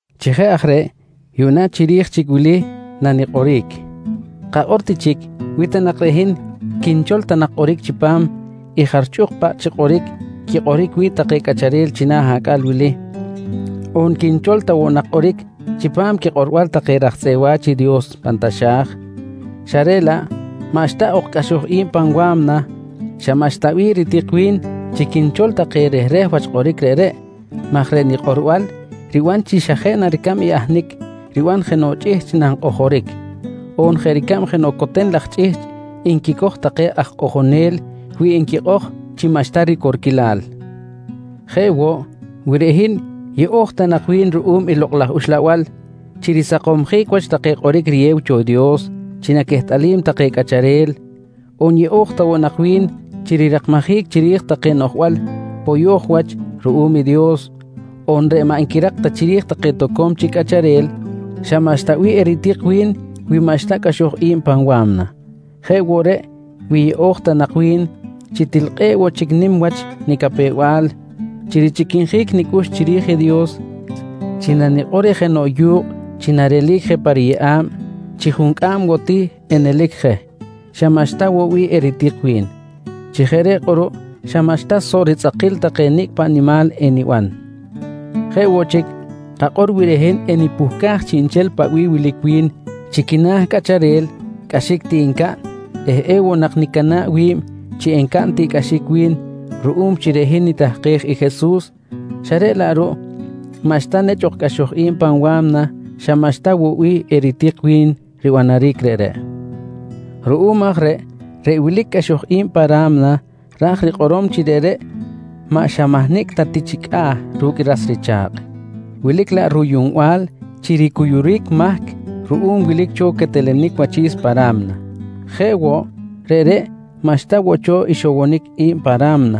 Chi jeꞌ aj reꞌ, yuꞌna chiri̱j chic wili nanikꞌoric: Kakꞌor ti chic, wi ta nak reꞌ hin quinchol ta nak kꞌoric chipam i jarchꞌuk paꞌ chi kꞌoric quikꞌoric wi̱ꞌ take cꞌacharel china̱ acꞌal wili on quinchol ta woꞌ nak kꞌoric chipam quikꞌorbal take raj tzꞌeꞌ wa̱ch i Dios pan taxa̱j xa reꞌ laꞌ maꞌxta ok cꞌaxoj i̱b pan wa̱mna, xa maꞌxta bih ritik wi̱n chi quinchol take rehreh wach kꞌoric reꞌreꞌ maj reꞌ nikꞌorbal riban xa jeꞌ na ricab i ahnic riban jenoꞌ chꞌihchꞌ nankꞌojoric, on jeꞌ ricab jenoꞌ coten laj chꞌihchꞌ nquicoj take aj kꞌojonel wi nquikꞌoj chi maꞌxta ricorquilal. Jeꞌ woꞌ, wi reꞌ hin yeꞌo̱j ta nak wi̱n ruꞌum i Lokꞌ laj Uxlabal chi risakomsjic wach take kꞌoric riyew cho i Dios chi naquehtꞌalim take cꞌacharel on yeꞌo̱j ta woꞌ nak wi̱n chi rirakmajic chiri̱j take noꞌjbal poyo̱j wach ruꞌum i Dios on reꞌ maꞌ nquirak ta chiri̱j take toco̱m chic cꞌacharel, xa maꞌxta bih eritik wi̱n mi maꞌxta cꞌaxoj i̱b pan wa̱mna. Jeꞌ woꞌ reꞌ wi yeꞌo̱j ta woꞌ nak wi̱n chi til kꞌe̱ꞌ woꞌ chic nim wach nicapew-bal chi richꞌiquinjic nicꞌux chiri̱j i Dios chi nanikꞌor reh jenoꞌ yu̱kꞌ chi narelic je pa riyeꞌa̱b chi juncꞌam woꞌ ti enelic je, xa maꞌxta woꞌ bih eritik wi̱n. Chi jeꞌ reꞌ kꞌuruꞌ xa maꞌxta soꞌ ritzꞌakil take nicꞌ paꞌ nimal eniban. Jeꞌ woꞌ chic, kakꞌor wi reꞌ hin enpuhcaj chiꞌnchel paꞌ bih wilic wi̱n chi quina̱ cꞌacharel cꞌaxic ti ncaꞌn eh ewoꞌ nak nicana̱ꞌ wi̱b chi encaꞌn tiꞌcꞌaxic wi̱n ruꞌum chi reꞌ hin nitahkej i Jesus, xa reꞌ laꞌ ruꞌ maꞌxta ok cꞌaxoj i̱b pa̱m wa̱mna, xa maꞌxta woꞌ bih eritik wi̱n ribanaric reꞌreꞌ. Ruꞌum aj reꞌ, reꞌ wilic cꞌaxoj i̱b pa ra̱mna ra̱j rikꞌorom chi reꞌreꞌ maꞌ xa mahnicꞌ ta ti chi cꞌa̱ ru̱cꞌ ras richa̱kꞌ, wilic laꞌ ruyuꞌnbal chi ricuyuric mahc ruꞌum wilic cho quetelenic wachi̱s pa ra̱mna. Jeꞌ woꞌ, reꞌreꞌ maꞌxta woꞌ cho ixowonic i̱b pa ra̱mna,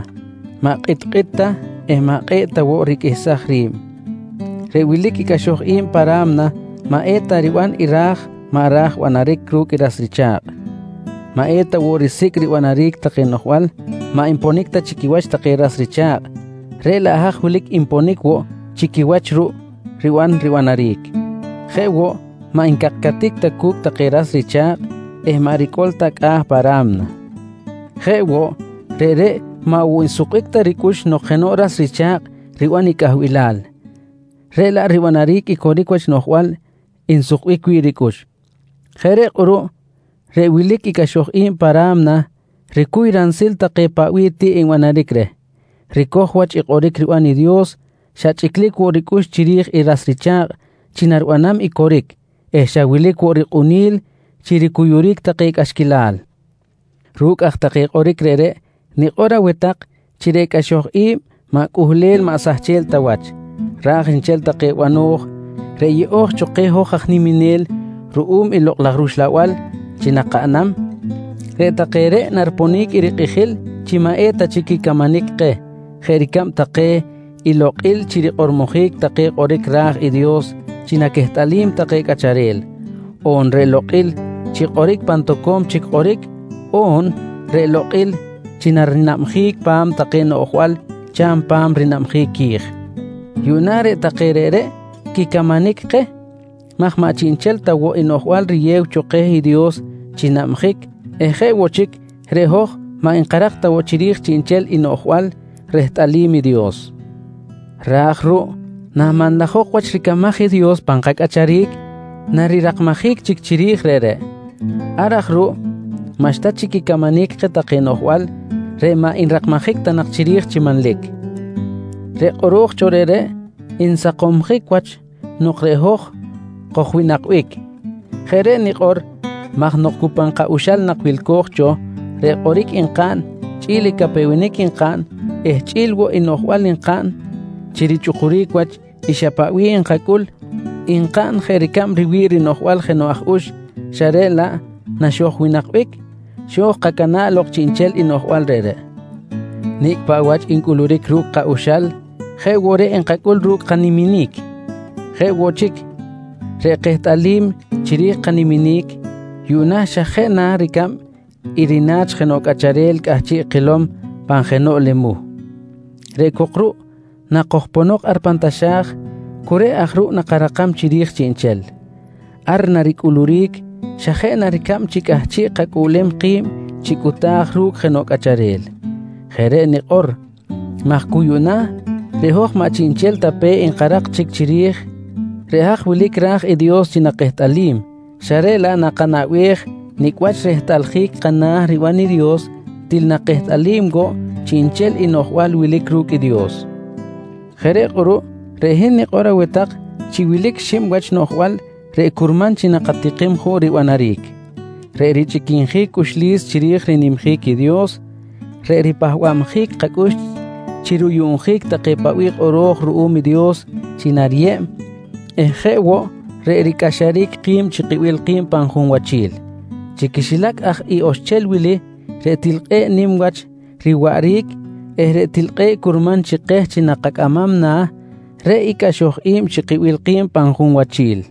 maꞌ kꞌitkꞌit ta eh maꞌ kꞌe̱ꞌ ta woꞌ riqꞌuihsaj ri̱b. Reꞌ wilic i cꞌaxoj i̱b pa ra̱mna maꞌ eta riban i ra̱j maꞌ ra̱j banaric ru̱cꞌ i ras richa̱kꞌ. Maꞌ eta woꞌ risicꞌ ribanaric take noꞌjbal maꞌ nponic ta chi quiwach take ras richa̱kꞌ, reꞌ laꞌ haj wilic nponic woꞌ chi quiwach ruꞌ riban ribanaric. Jeꞌ woꞌ, maꞌ ncakcatic ta cu̱cꞌ take ras richa̱kꞌ eh maꞌ ricꞌol ta cꞌa̱ pa ra̱mna. Jeꞌ woꞌ, reꞌreꞌ maꞌ woꞌ nsukbic ta ricꞌux nok jenoꞌ ras richa̱kꞌ riban i cꞌahbilal, reꞌ laꞌ ribanaric i coric wach noꞌjbal nsukbic wi̱ꞌ ricꞌux. Jeꞌ reꞌ kꞌuruꞌ reꞌ wilic i cꞌaxoj i̱b pa ra̱mna ricuy ransil take paꞌ bih tiꞌ nbanaric reh, ricoj wach i kꞌoric riban i Dios, xa chꞌiclic woꞌ ricꞌux chiri̱j i ras richa̱kꞌ chi naribanam i coric eh xa wilic woꞌ rikꞌuni̱l chi ricuyuric take cꞌaxquilal. Ru̱cꞌ aj take kꞌoric reꞌreꞌ nikꞌor aweh tak chi reꞌ cꞌaxoj i̱b maꞌ cꞌuhlel maꞌ sahchel ta wach, ra̱j nchel take bano̱j reꞌ yeꞌo̱j cho keh hoj aj niminel ruꞌum i Lokꞌ laj rUxlabal chi nakaꞌnam reꞌ take reꞌ nariponic i rikꞌijil chi maꞌeta chic quicamanic keh jeꞌ ricab take i lokꞌil chi rikꞌormojic take kꞌoric ra̱j i Dios chi naquehtꞌalim take cꞌacharel, on reꞌ lokꞌil chi kꞌoric pan tak toco̱m chic kꞌoric on reꞌ lokꞌil chi rinabjic pa̱m take noꞌjbal cha̱m pa̱m rinabjic qui̱j. Yuꞌna reꞌ take reꞌreꞌ quicamanic keh maj maꞌ chiꞌnchel ta woꞌ i noꞌjbal riyew cho keh i Dios chi nabjic eh jeꞌ woꞌ chic reꞌ hoj maꞌ nkarak ta woꞌ chiri̱j chiꞌnchel i noꞌjbal rehtꞌalim i Dios, raj ruꞌ namanlajok wach ricamaj i Dios pan kacꞌacharic narirakmajic chic chiri̱j reꞌreꞌ. Ar aj ruꞌ maꞌxta chic quicamanic keh take noꞌjbal reꞌ maꞌ nrakmajic ta nak chiri̱j chi manlic. Reꞌ kꞌoro̱j cho reꞌreꞌ nsakomjic wach nok reꞌ hoj kojwinakbic. Jeꞌ reꞌ nikꞌor maj nok cu pan ka-uxal nak wilco̱j cho reꞌ kꞌoric nkaꞌn chꞌi̱l i capewenic nkaꞌn eh chꞌi̱l woꞌ i noꞌjbal nkaꞌn chi richꞌukuric wach i xa paꞌ bih nkacꞌul, nkaꞌn jeꞌ ricab riwi̱ꞌ rinoꞌjbal jenoꞌ aj ux, xa reꞌ laꞌ naxojwinakbic xo̱j kacana̱ꞌ lok chiꞌnchel i noꞌjbal reꞌreꞌ. Nicꞌ paꞌ wach ncꞌuluric ru̱cꞌ ka-uxal jeꞌ woꞌ reꞌ nkacꞌul ru̱cꞌ kaniminic. Jeꞌ woꞌ chic, reꞌ kehtꞌalim chiri̱j kaniminic yuꞌna xa jeꞌ na ricab i rina̱ch jenoꞌ cꞌacharel cꞌahchiꞌ kilom je pan jenoꞌ lemuh. Reꞌ cok ruꞌ nakojponok ar pan taxa̱j, cu reꞌ aj ruꞌ nakarakam chiri̱j chiꞌnchel. Ar naricꞌuluric xa jeꞌ na ricab chi cꞌahchiꞌ kacꞌuꞌlem ki̱b chi cꞌuta̱j ru̱cꞌ jenoꞌ cꞌacharel. Jeꞌ reꞌ nikꞌor maj cu yuꞌna, reꞌ hoj maꞌ chiꞌnchel ta pe nkarak chic chiri̱j reꞌ haj wilic ra̱j i Dios chi nakehtꞌalim, xa reꞌ laꞌ nakanaꞌbej nicꞌ wach rehtꞌaljic kana̱ riban i Dios til nakehtꞌalim woꞌ chiꞌnchel i noꞌjbal wilic ru̱cꞌ i Dios. Jeꞌ reꞌ kꞌuruꞌ, reꞌ hin nikꞌor aweh tak chi wilic xib wach noꞌjbal reꞌ curman chi nakatikim juꞌ ribanaric: Reꞌ richꞌiquinjic cꞌuxlis chiri̱j rinimjic i Dios, reꞌ ripahba̱bjic kacꞌux chi ruyuꞌnjic take paꞌ bih kꞌoro̱j ruꞌum i Dios chi nariyeb eh jeꞌ woꞌ reꞌ ricꞌaxaric ki̱b chi kibil ki̱b pan junwachil. Chi quixilac aj i oxchel wili, reꞌ til kꞌe̱ꞌ nim wach riwaꞌric eh reꞌ til kꞌe̱ꞌ curman chi keh chi nakacꞌamam na̱, reꞌ i cꞌaxoj i̱b chi kibil ki̱b pan junwachil.